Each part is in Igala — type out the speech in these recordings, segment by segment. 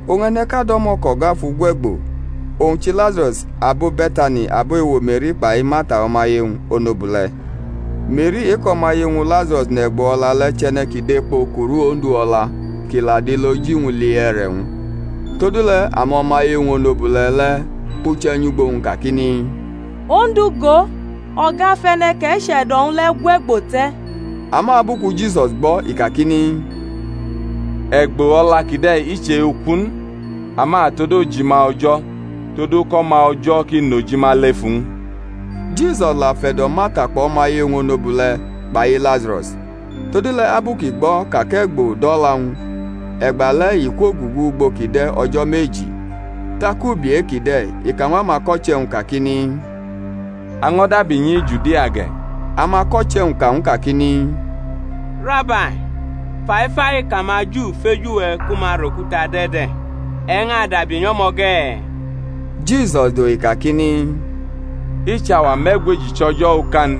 Oñ e̩ne̩ʼka do̩mo̩ kʼo̩ga fʼu gwe̩gbo, owñ chʼiLazaro̩s abo Be̩tani, abo ewo Me̩ri kpai Marta o̩maye-wñ onobule̩. Me̩ri e-kʼo̩maye-wñ Lazaro̩s nʼe̩gbo o̩la le̩ chʼe̩ne̩ ki dʼekpo kuru Ondu o̩la, kʼi la dʼiloji-wñ li e̩re̩-wñ. Todule̩ amo̩maye-wñ onobule̩ le̩ kpuche̩ nyʼugbo-wñ kakini, Ondu, go, o̩ga fʼe̩ne̩ kʼe̩ che̩do̩-wñ le̩ gwe̩gbo te̩. Ama abu ku Jisus gbʼo̩ i kakini, E̩gbo o̩la kide̩ i chʼe-uku n, ama tod ojima O̩jo̩, todu kʼO̩ma O̩jo̩ ki nʼojima lef uwñ. Jisus la fe̩do̩ Marta kpʼo̩maye-wñ onobule̩ kpai Lazaro̩s. Todule̩ abu kʼi gbo̩ ka kʼe̩gbo dʼo̩la-wñ, e̩gbale̩ i kwogugu ugbo kʼi de̩ o̩jo̩ meji. Tak ubi e-kide̩ i ka ñw amako̩che̩-wñ kakini, A ño̩ dabi nyi Judia ge̩. Amako̩che̩-wñ ka ñw u kakini, Rabai, faifai kʼamaJu feju we̩ ku ma rʼokuta dʼe̩ de̩, e̩ ñʼadabi nyʼo̩mo̩ ge̩? Jisus dohi kakini, I chʼauwa me̩gweji chʼo̩jo̩ oka n?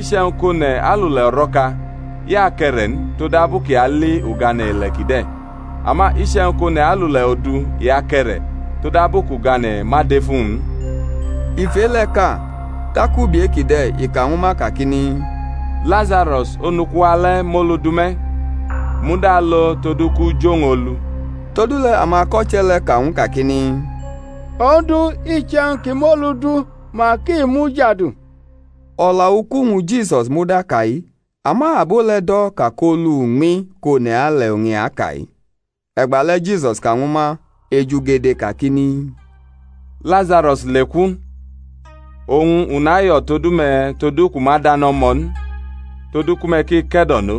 Iche̩wñ kʼone̩ alule̩ o̩ro̩ka, i ake̩re̩ n, todabu kʼi ali ugane̩ ile̩ kide̩. Ama iche̩wñ kʼone̩ alule̩ odu i ake̩re̩, todabu kʼugane̩ ma dʼef uwñ n. I fʼe-le̩ ka; tak ubi e-kide̩ i ka ñwu ma kakini, Lazaro̩s, onuku-wa le̩ mʼolu du me̩; u muda alo todu kʼu jʼuwñ olu. Todule̩ amako̩che̩ le̩ ka ñw u kakini, Ondu, iche̩wñ kʼi mʼolu du, mak i mujadu. O̩la uku-wñ Jisus muda ka-i; ama abo le̩ do̩ ka kʼolu uñmi kʼone̩ ale̩ oñ i aka-i. E̩gbale̩ Jisus ka ñwu ma ejugede kakini, Lazaro̩s leku. Oñ u nayo̩ todu me̩ todu kʼu ma dʼane̩ o̩mo̩ n, todu ku me̩ ki ke̩do̩no;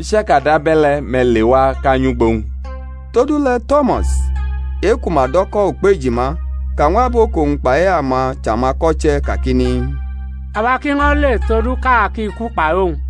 i chaka dʼabe̩le̩ me̩ lewa, kʼa nyʼugbo-wñ. Todule̩ To̩mas, e-ku ma do̩ ko̩ Ukpejima, ka ñw abo kʼowñ kpai ama chʼamako̩che̩ kakini, Awa ki ño̩ le, todu kʼa ki ku kpai owñ.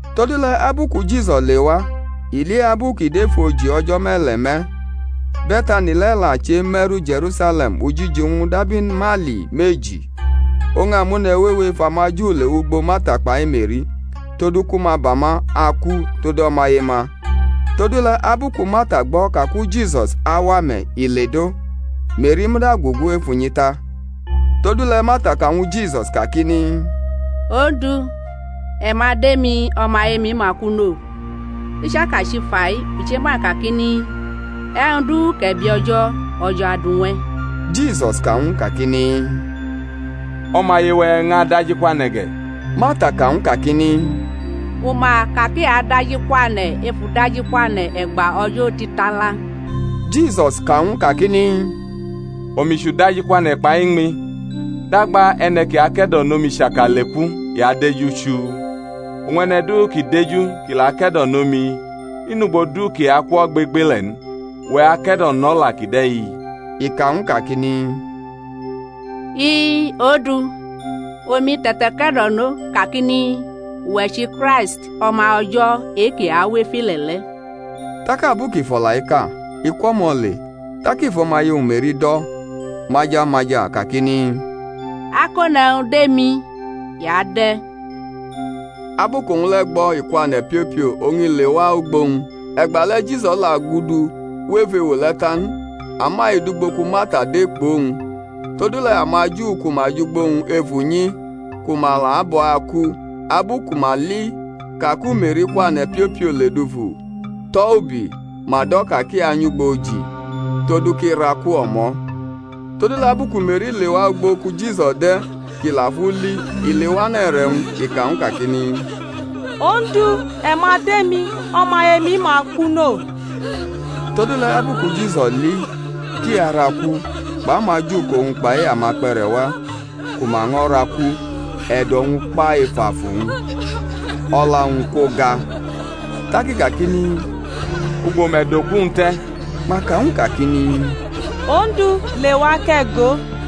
Todule̩ abu ku Jisus lewa, i li abu kʼi dʼef oji o̩jo̩ me̩le̩ me̩. Be̩tani le̩ la cheme̩ru Je̩rusale̩m ujiji-wñ dab imaili meji. Oñ amone̩ wewe ef amaJu lewʼugbo Marta kpai Me̩ri, todu ku ma ba ma aku tod o̩maye-ma. Todule̩ abu ku Marta gbo̩ ka ku Jisus awa me̩, i ledʼo; Me̩ri muda gugu ef unyi ta. Todule̩ Marta ka ñwu Jisus kakini, Ondu, e̩ ma dʼemi, o̩maye-mi ma ku no. I chaka chʼifa-i, u chema kakini, E̩wñ du kʼe̩ bi O̩jo̩, O̩jo̩ adu ñw e̩. Jisus ka ñw u kakini, O̩maye-we̩ ñʼadajikwane̩ ge̩. Marta ka ñw u kakini, U ma ka kʼi ada-jikwane̩ ef udajikwane̩ e̩gba o̩jo̩ otitala. Jisus ka ñw u kakini, Omi chʼuda-jikwane̩ kpai iñmi: dagba e̩ne̩ ki ake̩do̩no mi chaka leku, i adeju chuu; oñ e̩ne̩ du ki deju kʼi la ake̩do̩no mi, i nʼugbo du kʼi aku ogbegbele̩ n. Uwe̩ ake̩do̩nʼo̩la kide̩-i? I ka ñw u kakini, I-i, Ondu; omi te̩take̩do̩no, kakini, Uwe̩ chʼiKraist O̩ma O̩jo̩ e-ki awʼef ile̩ le̩. Tak abu kʼi fʼo̩la-i ka, i kwʼo̩mo̩ le, tak i fʼo̩maye-wñ Me̩ri do̩ maja maja, kakini, Akone̩wñ dʼemi, i adʼe̩. Abu kʼowñ le̩ gbo̩ i kwane̩ piopio, oñ i lewa ugbo-wñ. (E̩gbale̩ Jisus la gudu wʼef ewo le̩ ta n, ama i dʼugbo ku Marta de kpʼowñ.) Todule̩ amaJu ku ma jʼugbo-wñ ef unyi, ku ma la abʼo̩ aku, abu ku ma li ka ku Me̩ri kwane̩ piopio ledufu, tʼo̩ ubi, ma do̩ ka kʼi anyʼugbo oji, todu kʼi raku o̩mo̩. Todule̩ abu ku Me̩ri lewʼugbo ku Jisus de̩ kʼi la fʼu li, i lewane̩ e̩re̩-wñ, i ka ñw u kakini, Ondu, e̩ ma dʼemi, o̩maye-mi ma ku no. Todule̩ abu ku Jisus li kʼi araku, kpʼamaJu kʼowñ kpai ama kpe̩re̩ wa ku ma ño̩ raku, e̩do̩-wñ kpa ef afu-wñ, o̩la-wñ kwoga; tak i kakini, Ugbo me̩ dʼoku-wñ te̩? Ma ka ñw u kakini, Ondu, lewa kʼe̩ go.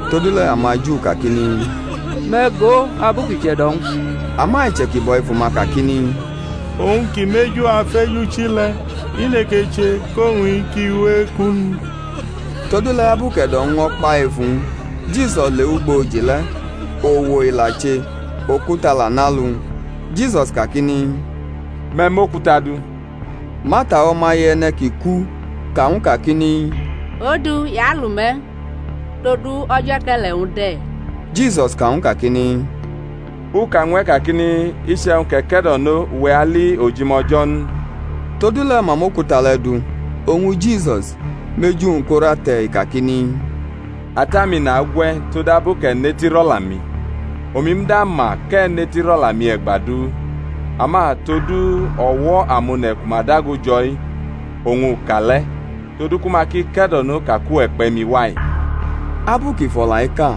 Todule̩ amaJu kakini, Me̩ go abu kʼi che̩do̩-wñ! Ama iche̩kibo̩ efu-ma kakini, Owñ ki mʼeju afeju chi le̩, i nekeche kʼowñ-i ki we eku n? Todule̩ abu kʼe̩do̩-wñ ño̩ kpa ef uwñ, Jisus lewʼugbo oji le̩; owo i la che, okuta la nʼalu-wñ. Jisus kakini, Me̩ mʼokuta du. Marta, o̩maye e̩ne̩ ki ku, ka ñw u kakini, Ondu, i alu me̩, todu o̩jo̩ e̩ke̩le̩-wñ de̩. Jisus ka ñw u kakini, U ka ñw e̩ kakini, Iche̩wñ kʼe̩ ke̩do̩no uwe̩ ali ojima O̩jo̩ n? Todule̩ ma mʼokuta le̩ du. Oñ Jisus mʼeju-wñ korʼate̩, i kakini, Ata-mi, nagwʼe̩ todabu kʼe̩ netirʼo̩la-mi. Omi muda ma kʼe̩ netirʼo̩la-mi e̩gba du; ama todu o̩wo̩ amone̩ ku ma dago jo̩-i oñ u ka le̩, todu ku ma ki ke̩do̩no ka kʼuwe̩ kpe̩ mi wa-i. Abu kʼi fʼo̩la-i ka,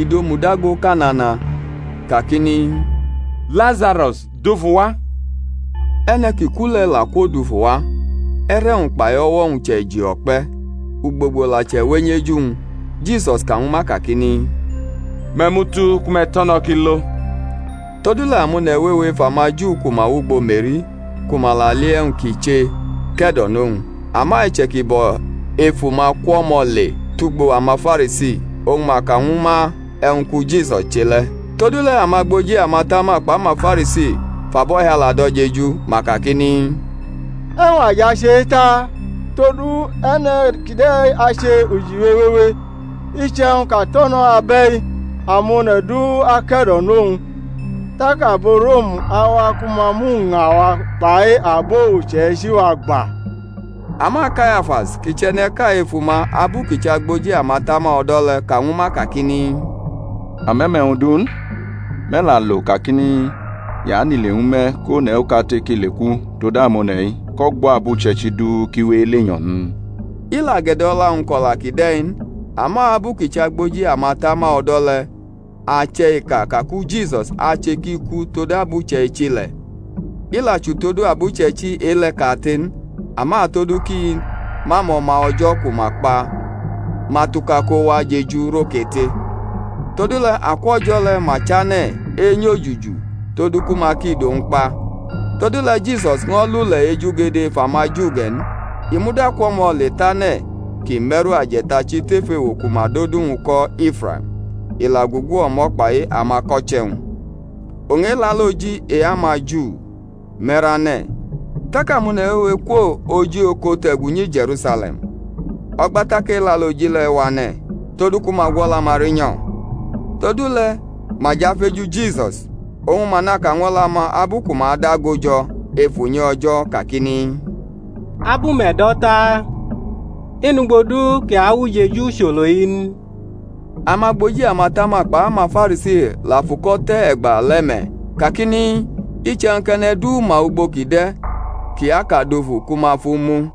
i dʼomu dago ka nana, kakini, Lazaro̩s, dufu wa. E̩ne̩ ki ku le̩ la kwodufu wa, e̩re̩-wñ kpai o̩wo̩-wñ chʼe̩ji o̩kpe̩; ugbogbo la chʼe̩wenyʼeju-wñ. Jisus ka ñwu ma kakini, Me̩ mʼu tu ku me̩ tʼo̩ no̩ kʼi lo. Todule̩ amone̩ wewe ef amaJu ku ma wʼugbo Me̩ri, ku ma la li e̩wñ kʼi che, ke̩do̩nʼowñ. Ama iche̩kibo̩ efu-ma kwʼo̩mo̩ le tʼugbo amaFarisi, oñ ma ka ñwu ma e̩wñ ku Jisus che le̩. Todule̩ amagboji amatama kpʼamaFarisi fʼabo̩hiala do̩ jeju, ma kakini, E̩wñ a jʼache-i taa? todu e̩ne̩ kide̩ ache ujiwe wewe. Iche̩wñ kʼa tʼo̩ no̩ abe̩-i, amone̩ du ake̩do̩nʼowñ, tak abo Rom awa ku ma mʼuña-wa kpai abo uche̩ichi-wa gba. Ama Kayafas, kʼi chʼe̩ne̩ʼka efu-ma abu kʼi chʼagboji amatama o̩do̩ le̩, ka ñwu ma kakini, Ame̩ mʼe̩wñ du n; me̩ la alo kakini, I anʼile ñwu me̩ kʼone̩ okate kʼi leku tod amone̩-i kʼo̩gbo̩ abuche̩ichi-i du ki we elenyo̩ n? I la gʼe̩do̩la-wñ ko̩la kide̩ n; ama abu kʼi chʼagboji amatama o̩do̩ le̩, ache̩ i ka ka ku Jisus ache kʼi ku tod abuche̩ichi le̩, i la chʼutodu abuche̩ichi e-le̩ kate n, ama todu kʼi mʼamo̩ma O̩jo̩ ku ma kpa ma tuka ko wa jeju rʼokate. Todule̩ akwʼo̩jo̩ le̩ ma chane̩ enyo-juju todu ku ma ki dʼowñ kpa. Todule̩ Jisus ño̩ lule̩ ejugede ef amaJu ge̩ n; i muda kwʼo̩mo̩ le tʼane̩ ki me̩ru aje̩tachi tef ewo ku ma dʼodu-wñ ko̩ Ifraim; i la gugu o̩mo̩ kpai amako̩che̩-wñ. Oñ Elaloji e-amaJu me̩rane̩; tak amone̩ wewe kwo oji oko te̩gu nyi Je̩rusale̩m o̩gba tak Elaloji le̩ wane̩ todu ku ma gwʼo̩la-ma rinyo̩. Todule̩ ma jʼafeju Jisus, oñ ma naka ñw o̩la-ma abu ku ma dago jo̩ ef unyi O̩jo̩ kakini, Abu me̩ do̩ taa? I nʼugbo du kʼi awʼujeju ucholo-i n? Amagboji amatama kpai amaFarisi la fʼuko̩ te̩ e̩gba le̩ me̩ kakini, Iche̩wñ kʼe̩ne̩ du ma ugbo kʼi de̩ kʼi ka dufu ku ma fʼu mu.